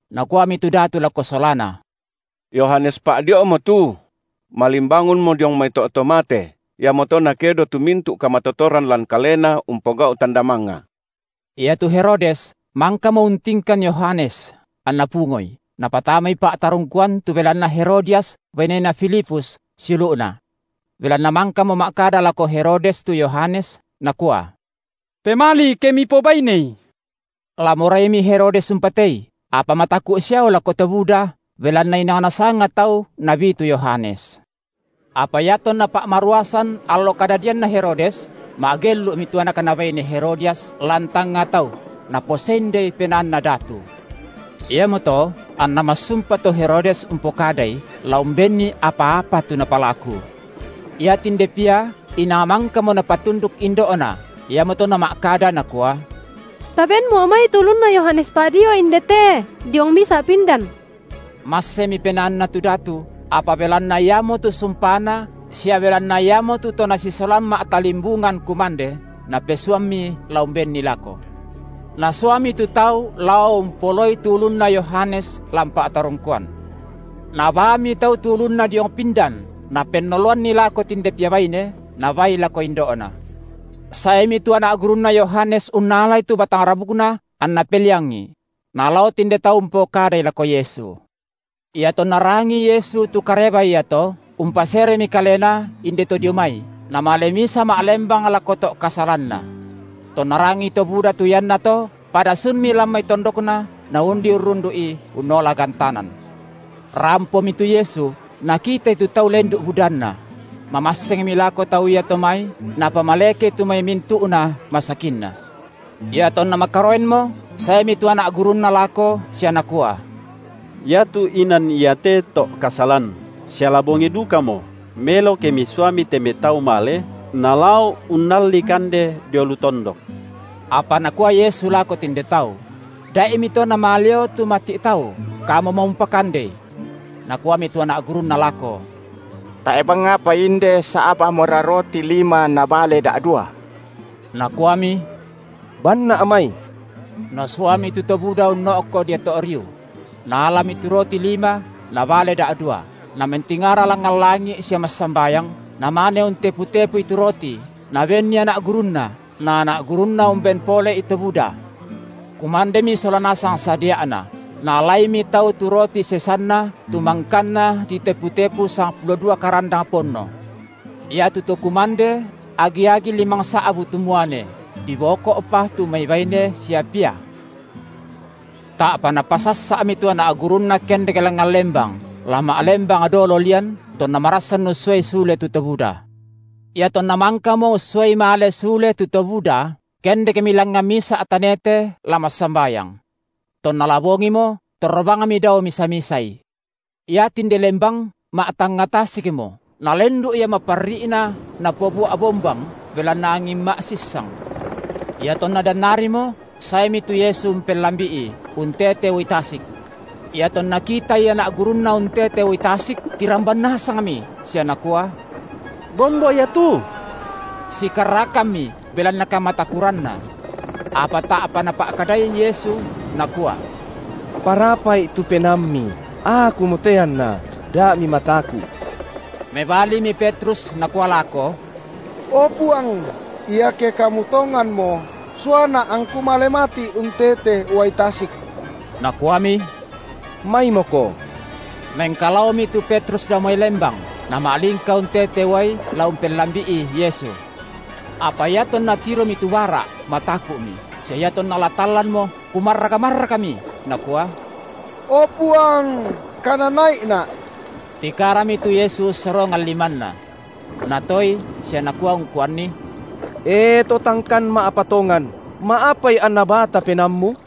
Nakuami tu datu lako solana: Yohanes Pa’dio’mo tu; malimbangunmo diong mai to’ to mate, iamoto nakedo tu mintu’ kamatotoran lan kalena umpogau’ tanda mangnga. Iatu Herodes mangkamo untingkan Yohanes anna pungoi, napatamai pa’tarungkuan tu belanna Herodias bainena Filipus, siulu’na. Belanna mangkamo ma’kada lako Herodes tu Yohanes nakua: Pemali ke mipobainei. La moraimi Herodes umpatei, apa mataku’ siao lako to buda belanna inang nasanga tau nabi tu Yohanes. Apa iatonna pa’maruasan allo kadadianna Herodes, ma’gellu’mi tu anakna baine Herodias lan tangnga tau, naposendei penaanna datu. Iamoto anna massumpa tu Herodes umpokadai, la umbenni apa-apa tu napalaku. Iatinde pia inang mangkamo napatunduk indo’na, iamoto nama’kada nakua: Tabenmo’ mai tu ulunna Yohanes Pa’dio’ indete, diong misa’ pindan. Massemi penaanna tu datu, apa belanna iamotu sumpana sia belanna iamotu to nasisolan ma’talimbungan kumande, napesuammi la umbenni lako. Nasuami tu tau lao umpoloi tu ulunna Yohanes lan pa’tarungkuan. Nabaami tau tu ulunna diong pindan, napennoloanni lako tinde pia baine, nabaai lako indo’na. Saemi tu anak gurunna Yohanes unnalai tu batang rabukna, anna peliangi; nalao tinde tau umpokadai lako Yesu. Iatonna rangii Yesu tu kareba iato, umpaseremi Kalena, inde to dio mai, Namale misa ma’lembang lako to’ kasalanna. Tonna rangii to buda tu iannato, pada sunmi lan mai tondokna naundi urrundu’I unnola gantanan. Rampomi tu Yesu, Nakitai tu tau lendu’ budanna; mamassengmi lako tau iato mai, Napamalekei tu mai mintu’na masakinna. Iatonna makaroenmo, saemi tu anak gurunNa lako sia nakua: Iatu inan iate to’kasalan, sia la bongi dukamo, melo ke Misuami te mai tau male, nalao unnalli kande dio lu tondok. Apa Nakua Yesu lako tinde tau; Dai’mito namaleo tu mati’ tau, kamumo umpakandei. Nakuami tu anak gurunNa lako: Tae’ bang apa inde, sa’bamora roti lima na bale da’dua. Nakuami: Banna’ mai. Nasuami tu to buda unno’ko dio to’ riu; Naalami tu roti lima na bale da’dua, Namentingara langngan langi’ sia massambayang, Namane untepu-tepui tu roti, Nabenni anak gurunNa, na anak gurunNa umben pole’i to buda. Kumandemi sola nasangi sadia’na. Naalaimi tau tu roti sesanna tu mangkanna ditepu-tepu sangpulo dua karandang ponno. Iatu to kumande agi-agi limangsa’bu tu muane, diboko’pa tu mai baine sia pia. Ta’pa Napasassa’mi tu anak gurunNa kendek langngan lembang, la ma’lembang dolo lian, tonna marassan ussuai sule tu to buda. Iatonna mangkamo ussuai male sule tu to buda, kendekmi langngan misa’ tanete la massambayang. Tonna la bongimo, torro bangmi dao misa-misaI. Iatinde lembang ma’tangnga tasikmo, nalendu’ ia maparri’na napobua’ bombang, belanna angin ma’sissang. Iatonna dannarimo saemi tu Yesu umpellambi’i, untete uai tasik. Iatonna kitaI anak gurunNa untete uai tasik, tiramban nasangmi sia nakua: Bombo ia tu! Sikarrakammi belanna kamatakuranna. Apa ta’pa Napa’kadai Yesu, Nakua: Parapa’i tu penaammi, Akumote anna, da mimataku’. Mebalimi Petrus nakua lako: O Puang, iake Kamu tonganmo, suana’ angku male mati’ untete uai tasik. Nakuami: Maimoko. Mengkalaomi tu Petrus dao mai lembang, nama’lingka untete uai la umpellambi’i Yesu. Apa iatonna tiromi tu bara’, mataku’mi; sia iatonna la tallanmo, kumarrak-marrakmi, nakua: O Puang kanana’ina’! Tikarami tu Yesu ussorongan limanNa. Natoei sia Nakua ungkuanni: E to tangkan ma’patongan, ma’apai anna bata penaammu?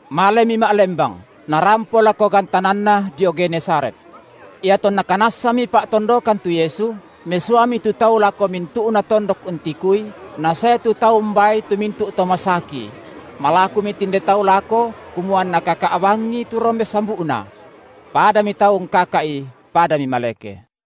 Malemi ma’lembang, narampo lako gantananna dio Genesaret. Iatonna kanassami pa’tondokan tu Yesu, mesuami tu tau lako mintu’na tondok untikui, nasae tu tau umbaai tu mintu’ to masaki; malakumi tinde tau lako kumua anna kaka’ bangi tu rombe sambu’Na. Padami tau ungkaka’I padami maleke.